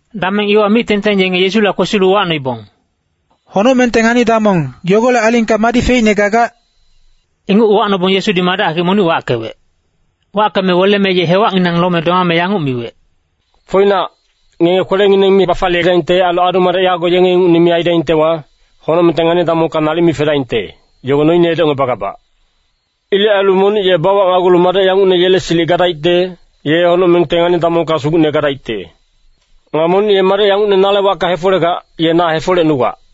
Dameng iwa mic-tengteng yenge Yesula kwesilu uwacnoibong, “Honocmengte ngani-damong, yogolec alingka madi feicne gagac?” Inguc uwacnobong Yesudi madec hakic monic wackewec. Wackeme weleme ye hewacnginang lome domame yanguc miwec, “Foinac, ngenge kwelengineng mi bafaliyedaingte ailu adu-madec yago yenge ingucne mi aidaingtewa, honocmengte ngani-damongka nalic mi fedaingte, yogo noine edocngebagabac. Ilec ailu monic ye bawacnagulu madec yangucne yele silic gadaicte, ye honocmengte ngani-damongka sugucne gadaicte. Nga monic ye madec yangucne nale wacka hefolegac, ye na hefolecnugac.”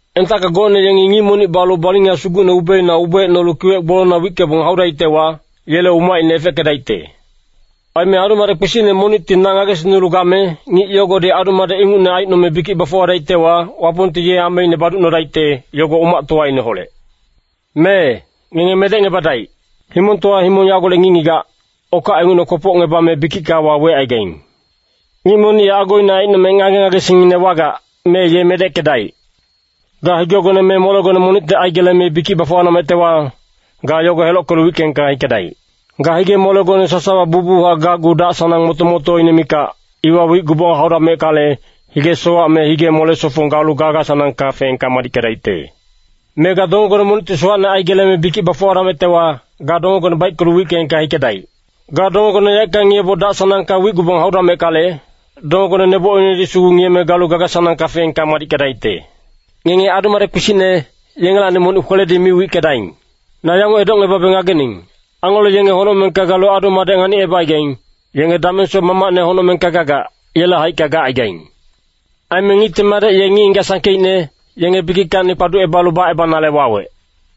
“Entacka gocne yengi ngic monic balu balinga sugucne ubeina ubeecnolu kiwec gbolongna wickebong haudaictewa, yele umacine efeckedaicte. Aime adu-madec kpisicne monicti na ngagesingnulu game, ngic yogodi adu-madec ingucne aicnome bikic bafuwadaictewa, Wapongti ye ameine baducnodaicte, yogo umactowaineholec. Mee, ngenge medecngebadaic. Himongtowa himong yagolec ngic-ngigac, okac ingucne kwopocngebame bikicka wawecaigaing. Ngic monic ye agoine aicnome ngage-ngagesingine wagac, mee ye medeckedaic. Ga higegone me molegone monicti aigeleme bikic bafuwadamectewa, ga yogo helockelu wickeengka hikedaic. Ga hige-molegone sasawa bucbuchac gacgu dac-sanang moto-motoine mikac, iwa wicgubong haudameckale, hige-sowac me hige-mole-sofong galu gaga-sanangka feengka madickedaicte. Me ga dongegone monicti sowacne aigeleme bikic bafuwadamectewa, ga dongegone baickelu wickeengka hikedaic. Ga dongegone yaeckanghac ngiyeboc dac-sanangka wicgubong haudameckale, dongegone nebocinedi sugu ngiyeme galu gaga-sanangka feengka madickedaicte. “Ngenge adu-madec kpisicne, yengelacni monic kweledi mi wickedaing. Na yanguc edocngebabe ngagening, angelo yenge honocmengka galu adu-madec nganicebacaigaing, yenge damengsoc Mamacne honocmengka gagac, yele haicka gacaigaing. [Aime Ngicte Madec ye ngic-ngigac sangkeicne, yenge bikickacni kpaducebalu bacebanale wawec.]”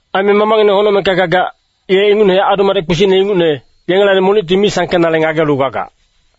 Aime Mamacngineng honocmengka gagac, ye ingucnehac adu-madec kpisicne ingucne, yengelacni monicti mi sangkenale ngagelu gagac.”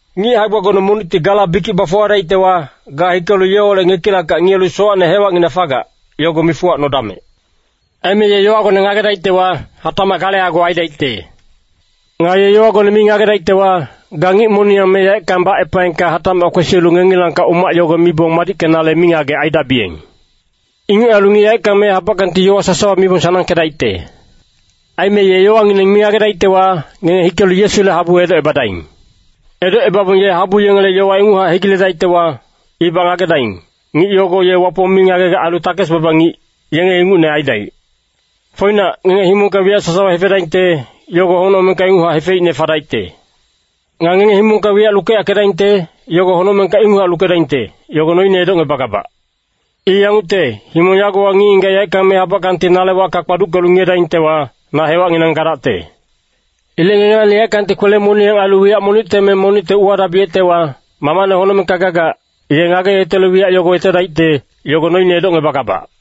“Ngic hae-gbagone monicti gala bikic bafuwadaictewa, ga hikelu yeholec ngekilackac ngiyelu sowacne hewacnginac fagac, yogo mifuwacnodamec. Aime ye yowagone ngagedaictewa, hatacmac gale ago aidaicte. Nga ye yowagone mi ngagedaictewa, ga ngic moniyang me yaeckang bacepaengka hatac kwesilu ngengilangkac umac yogo mibong madickenale mingagec aidabiyeng. Inguc ailu ngic yaeckang me habackangti yowa sasawa mibong sanangkedaicte. “Aime ye yowangineng mi ngagedaictewa, ngenge hikelu Yesule habu edocebadaing. Edocebabong ye habu yengele yowa inguchac hegiledaictewa, ibac ngagedaing, ngic yogo ye Wapong mi ngagegac ailu takes-baba ngic, yenge ingucne aidaic. “Foinac, ngenge himongka wiyac sasawa hefedaingte, yogo honocmengka inguchac hefeicne fadaicte. Nga ngenge himongka wiyac lukeyackedaingte, yogo honocmengka inguchac lukedaingte, yogo noine edocngebagabac. I yangucte, himong yagowa ngic-ngigac yaeckang me habackangti nale wacka kpaduckelu ngiyedaingtewa, na hewacnginang gadacte. Ilec ngengelacni yaeckangti kwele-moniyang ailu wiyac monicte me monicte uwadabiyectewa, Mamacne honocmengka gagac, ye ngageyetelu wiyac yogo yetedaicte, yogo noine edocngebagabac.”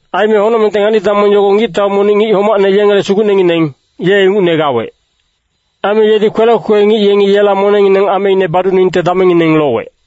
“Aime honocmengte ngani-damong yogo ngictau monic ngic homacne yengele sugucnengineng, ye ingucne gawec. Aime yedi kwelec kwekwe ngic yengi yela monengngineng ameine baduningte damengngineng lowec.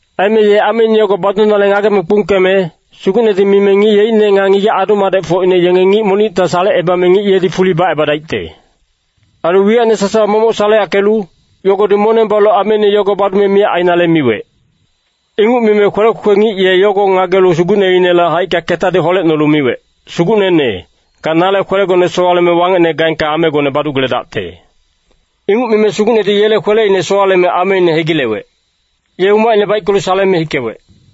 Aime ye ameine yogo badunale ngageme kpungkeme, sugucnedi mime ngic yeicne nga ngigac adu-madecfocine yenge ngic monicta salecebame ngic yedi fuli bacebadaicte. Ailu wiyacine sasawa momoc saleyackelu, yogodi moneng balu ameine yogo badume miyac ainale miwec. “Inguc mime kwelec kwekwe ngic ye yogo ngagelu sugucneinele haicka ketadi holecnolu miwec, ‘Sugucnene, ga nale kwelegone sowaleme wangecne gaengka amegone badugeledacte.’ Inguc mime sugucnedi yele kweleine sowaleme ameine hegilewec. Ye umacine baickelu saleme hikewec.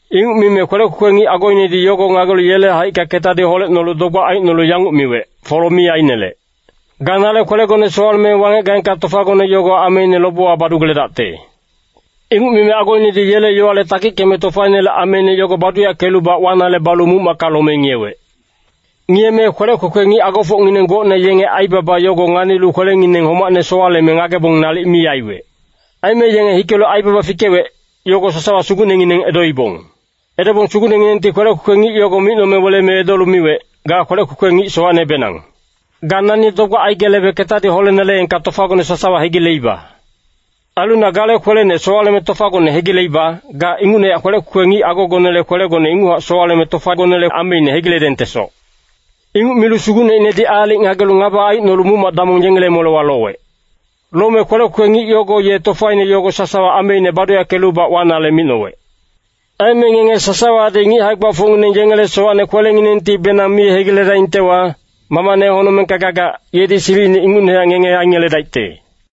“Inguc mime kwelec kwekwe ngic agoinedi yogo ngagelu yele haicka ketadi holecnolu dogbac aicnolu yanguc miwec, ‘Folo mi ainelec. Ga nale kwelegone sowaleme wangec gaengka tofagone yogo ameine lobewa badugeledacte.’ “Inguc mime agoinedi yele yowale takickeme tofainele ameine yogo baduyackelubac wanale balu muc-macka lome ngiyewec. Ngiyeme kwelec kwekwe ngic agofocngineng gocne yenge aibaba yogo nganilu kwelengineng homacne sowaleme ngagebong nalic mi aiwec. Aime yenge hikelu aibaba fikewec, yogo sasawa sugucnengineng edoibong. “Edobong sugucnenginengti kwelec kwekwe ngic yogo micnome weleme edolu miwec, ‘Ga kwelec kwekwe ngic sowacnebenang. Ga nani dogbac aigelebe ketadi holeneleengka tofagone sasawa hegileiba. Ailu na gale kwelene sowaleme tofagone hegileiba, ga ingucnehac kwelec kwekwe ngic agogonele kwelegone inguchac sowaleme tofagonele ameine hegiledengtesoc.’ Inguc milu sugucneinedi aalic ngagelu ngaba aicnolu muc-mac damong yengele molewa lowec. Lome kwelec kwekwe ngic yogo ye tofaine yogo sasawa ameine baduyackelubac wanale micnowec. “Aime ngenge sasawadi ngic hae-gbafocngineng yengele sowacne kwelenginengtibenang mi hegiledaingtewa, Mamacne honocmengka gagac, yedi silicine ingucnehac ngenge aingeledaicte.”